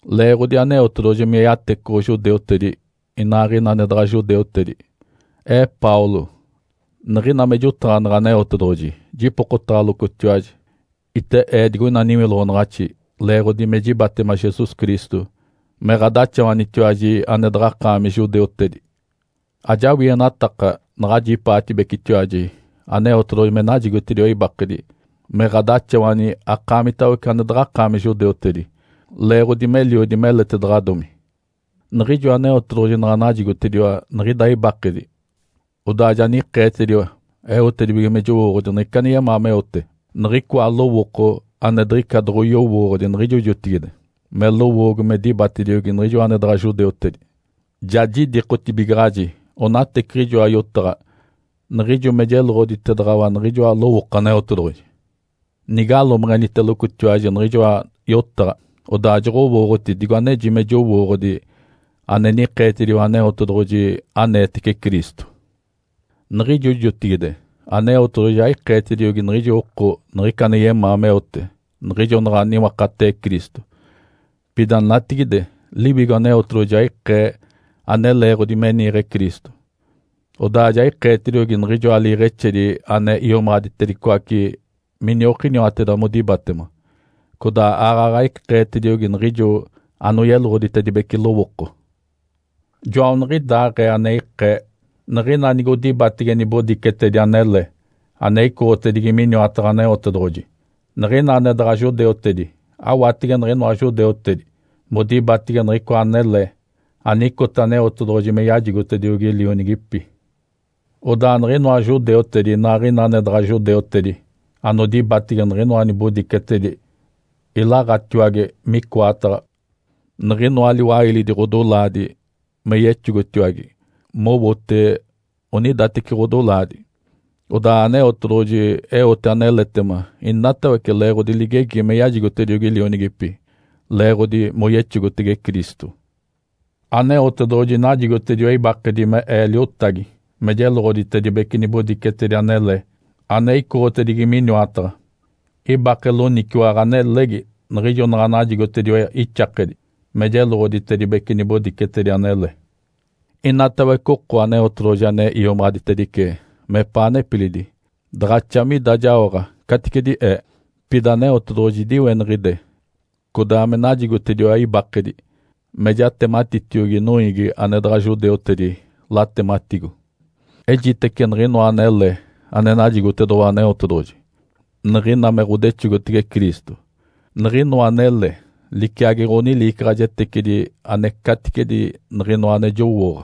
Leeɡ̶odi Aneotedoɡ̶oji me yatecoɡ̶o judeutedi inaaɡ̶ina ane daɡ̶a judeutedi, ee Paulo, niɡ̶ina me jotaɡ̶aneɡ̶e Aneotedoɡ̶oji jipokotaɡ̶alocotiwaji. Ite ee digoina niwiloɡ̶onaɡ̶axi leeɡ̶odi me jibatema Jesus Cristo me ɡ̶adaxawanitiwaji ane daɡ̶akaami judeutedi. Ajawienataka naɡ̶ajipaatibecetiwaji Aneotedoɡ̶oji me najigotediwa ibakedi me ɡ̶adaxawani akaamitawece ane daɡ̶akaami judeutedi, leeɡ̶odi meliodi meletedaɡ̶adomi. Niɡ̶ijo Aneotedoɡ̶oji naɡ̶a najigotediwa niɡ̶ida ibakedi, odaa ja nikeetediwa eote me jowooɡ̶odi niɡ̶ica ane yemaa meote, niɡ̶icoa lowooko ane diɡ̶ica doɡ̶oyowooɡ̶odi niɡ̶ijo jotigide, me lowoogo me dibatediogi niɡ̶ijo ane daɡ̶a judeutedi. Ja jidikotibigaɡ̶aji onateciɡ̶ijoa yotaɡ̶a niɡ̶ijo me jeloɡ̶oditedaɡ̶awa niɡ̶ijoa lowooko Aneotedoɡ̶oji. Nigalomeɡ̶enitelocotiwaji niɡ̶ijoa yotaɡ̶a, odaa joɡ̶owooɡ̶oti digo aneji me jowooɡ̶odi ane nikeetediwa Aneotedoɡ̶oji aneetece Cristo. Niɡ̶ijo jotigide Aneotedoɡ̶oji aikeetediogi niɡ̶ijo oko niɡ̶ica ane yemaa meote niɡ̶ijo naɡ̶a niwakatee Cristo. Pida natigide Liwigo Aneotedoɡ̶oji ja ikee ane leeɡ̶odi me niiɡ̶e Cristo. Odaa ja ikeetediogi niɡ̶ijoa liiɡ̶exedi ane iomaɡ̶aditedicoace miniokiniwateda modibatema, codaa aaɡ̶aɡ̶a ikeetediogi niɡ̶ijo anoyeloɡ̶oditedibece lowooko. Joaniɡ̶idaaɡ̶ee ane ikee. Niɡ̶ina nigodibatege nibodicetedi anele ane icoɡ̶otedigi miniwataɡ̶a Aneotedoɡ̶oji, niɡ̶ina ane daɡ̶a judeutedi awatege niɡ̶inoa judeutedi modibatege niɡ̶icoa anele anicota Aneotedoɡ̶oji me yajigotediogi lionigipi. Odaa niɡ̶inoa judeutedi inaaɡ̶ina ane daɡ̶a judeutedi anodibatege niɡ̶inoa nibodicetedi ilaɡ̶atiwage micoataɡ̶a niɡ̶inoa liwailidi ɡ̶odolaadi me yexogotiwage mowote onidateci ɡ̶odolaadi. Odaa Aneotedoɡ̶oji eote aneletema inatawece leeɡ̶odi ligegi me yajigotediogi lionigipi, leeɡ̶odi moyexogotege Cristo. Aneotedoɡ̶oji najigotediwa ibakedi me ee liotagi me jeloɡ̶oditedibece nibodicetedi anele ane icoɡ̶otedigi miniwataɡ̶a. Ibake loniciwaɡ̶a nelegi niɡ̶ijo naɡ̶a najigotediwa ixakedi me jeloɡ̶oditedibece nibodicetedi anele. Inatawece oko Aneotedoɡ̶oji ane iomaɡ̶aditedice mepaa nepilidi daɡ̶axa mida jaoɡ̶a caticedi ee. Pida Aneotedoɡ̶oji idiweniɡ̶ide, codaa me najigotediwa ibakedi me jatematitiogi noiigi ane daɡ̶a judeutedi, latematigo. Ejitece niɡ̶inoa anele ane najigotedoɡ̶owa Aneotedoɡ̶oji niɡ̶ina me ɡ̶odexogotege Cristo. Niɡ̶inoa anele liciagi ɡ̶oniliicaɡ̶ajetecidi ane caticedi niɡ̶inoa ane jowooɡ̶a.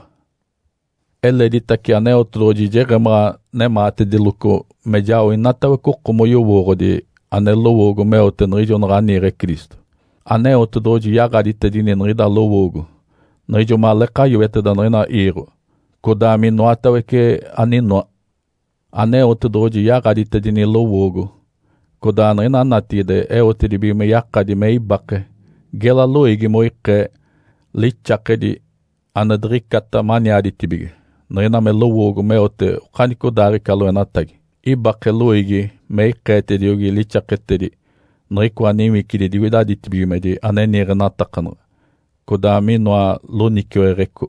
Eleditace Aneotedoɡ̶oji jeɡ̶emaɡ̶a nemaatediloco me jao inatawece oko moyowooɡ̶odi ane lowoogo meote niɡ̶ijo naɡ̶a niiɡ̶e Cristo. Aneotedoɡ̶oji yaɡ̶aditedini niɡ̶ida lowoogo niɡ̶ijo maleeka yoeteda niɡ̶ina iiɡ̶o, codaa minoatawece aninoa. Aneotedoɡ̶oji yaɡ̶aditedini lowoogo codaa niɡ̶ina natigide eotedibige me yakadi me ibake gela loiigi moikee lixakedi ane diɡ̶icata maniaditibige niɡ̶ina me lowoogo meote okanicodaaɡ̶ica loenatagi. Ibake loiigi me ikeetediogi lixaketedi niɡ̶icoa niwicidi digoida ditibigimedi ane niiɡ̶enatakanaɡ̶a, codaa minoa loniciweɡ̶eco.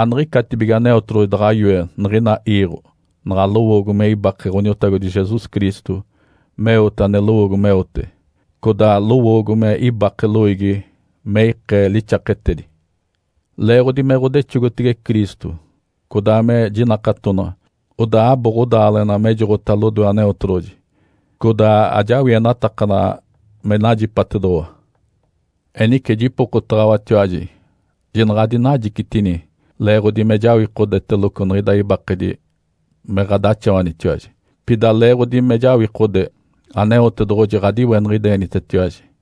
Aniɡ̶icatibige Aneotedoɡ̶oji daɡ̶a yoe niɡ̶ina iiɡ̶o naɡ̶a lowoogo me ibake Ǥoniotagodi Jesus Cristo meote ane lowoogo meote, codaa lowoogo me ibake loiigi me ikee lixaketedi. Leeɡ̶odi me ɡ̶odexogotege Cristo, codaa me jinakatonaɡ̶a, odaa abo ɡ̶odaaleɡ̶ena mejoɡ̶ota lodoe Aneotedoɡ̶oji, codaa ajawienatakanaɡ̶a me najipatedoɡ̶owa. Enice jipokotaɡ̶awatiwaji, jinaɡ̶adinajicitini leeɡ̶odi me jawikodeteloco niɡ̶ida ibakedi me ɡ̶adaxawanitiwaji. Pida leeɡ̶odi me jawikode Aneotedoɡ̶oji ɡ̶adiweniɡ̶idenitetiwaji.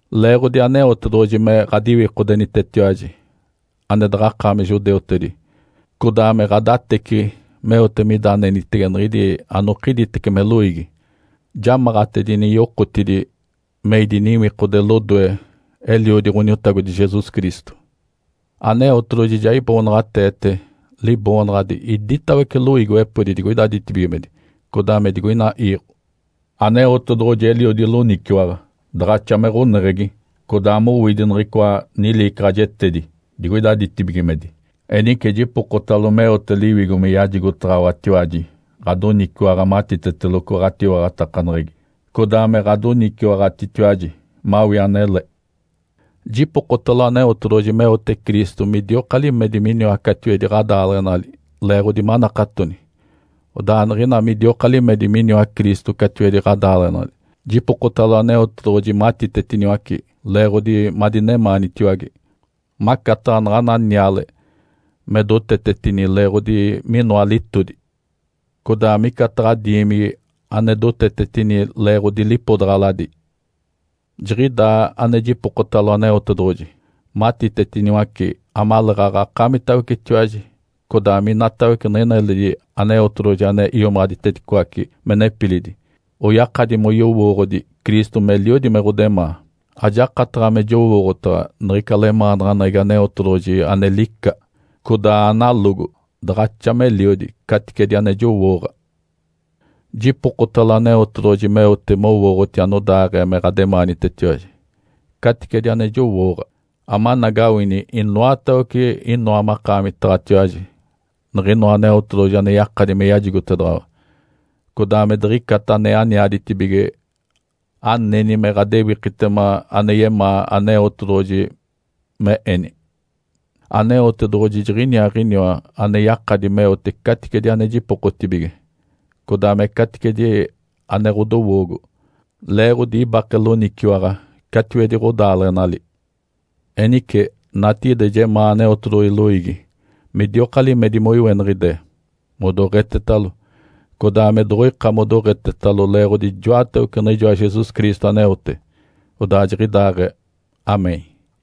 Leeɡ̶odi Aneotedoɡ̶oji me ɡ̶adiwikodenitetiwaji ane daɡ̶akaami judeutedi, codaa me ɡ̶adateciɡ̶i meote mida anenitege niɡ̶idi anokigitece me loiigi, jamaɡ̶atedini yokotidi me idiniwikode lodoe, Eliodi Ǥoniotagodi Jesus Cristo. Aneotedoɡ̶oji ja iboonaɡ̶ateete Liboonaɡ̶adi iditawece loiigiwepodi digoida ditibigimedi codaa me digoina iiɡ̶o. Aneotedoɡ̶oji eliodi loniciwaɡ̶a, daɡ̶axa me ɡ̶oneɡ̶egi, codaa mowidi niɡ̶icoa niliicaɡ̶ajetedi digoida ditibigimedi. Enice jipokotalo meote Liwigo me yajigotaɡ̶awatiwaji ɡ̶adoniciwaɡ̶a matiteteloco ɡ̶atiwaɡ̶atakaneɡ̶egi, codaa me ɡ̶adoniciwaɡ̶atitiwaji mawii anele. Jipokotalo Aneotedoɡ̶oji meote Cristo midioka limedi miniwa catiwedi ɡ̶adaaleɡ̶enali leeɡ̶odi manakatoni. Odaa niɡ̶ina midioka limedi miniwa Cristo catiwedi ɡ̶adaaleɡ̶enali, jipokotalo Aneotedoɡ̶oji matitetiniwace leeɡ̶odi madinemaanitiwage, macataɡ̶a naɡ̶ana niale me dotetetini leeɡ̶odi minoa litodi, codaa micataɡ̶a diimigi ane dotetetini leeɡ̶odi lipodaɡ̶aladi. Jiɡ̶idaa ane jipokotalo Aneotedoɡ̶oji matitetiniwace amaleeɡ̶aɡ̶a akaamitawecetiwaji codaa minatawece niɡ̶ina eledi Aneotedoɡ̶oji ane iomaɡ̶aditedicoace me nepilidi, oyakadi moyowooɡ̶odi Cristo meliodi me ɡ̶odemaa. Ajakataɡ̶a me jowooɡ̶otaɡ̶a niɡ̶ica lemaanaɡ̶aneɡ̶egi Aneotedoɡ̶oji, ane lica, codaa analogo daɡ̶axa meliodi, caticedi ane jowooɡ̶a. Jipokotalo Aneotedoɡ̶oji meote mowooɡ̶oti anodaaɡ̶ee me ɡ̶ademaanitetiwaji, caticedi ane jowooɡ̶a, amanagawini inoatawece inoa makaamitaɡ̶atiwaji niɡ̶inoa Aneotedoɡ̶oji ane yakadi me yajigotedaɡ̶awa, codaa me diɡ̶icata ane aniaditibige aneni me ɡ̶adewikitema ane yemaa Aneotedoɡ̶oji me eni. Aneotedoɡ̶oji jiɡ̶iniaaɡ̶iniwa ane yakadi meote caticedi ane jipokaɡ̶atibige, codaa me caticedi ane ɡ̶odowoogo, leeɡ̶odi ibake loniciwaɡ̶a catiwedi ɡ̶odaaleɡ̶enali. Enice, natigide jemaanaɡ̶a Aneotedoɡ̶oji loiigi midioka limedi moiweniɡ̶ide, modoɡ̶etetalo, codaa me doɡ̶oika modoɡ̶etetalo leeɡ̶odi ijoatawece niɡ̶ijoa Jesus Cristo aneote. Odaa jiɡ̶idaaɡ̶ee. (Amém.)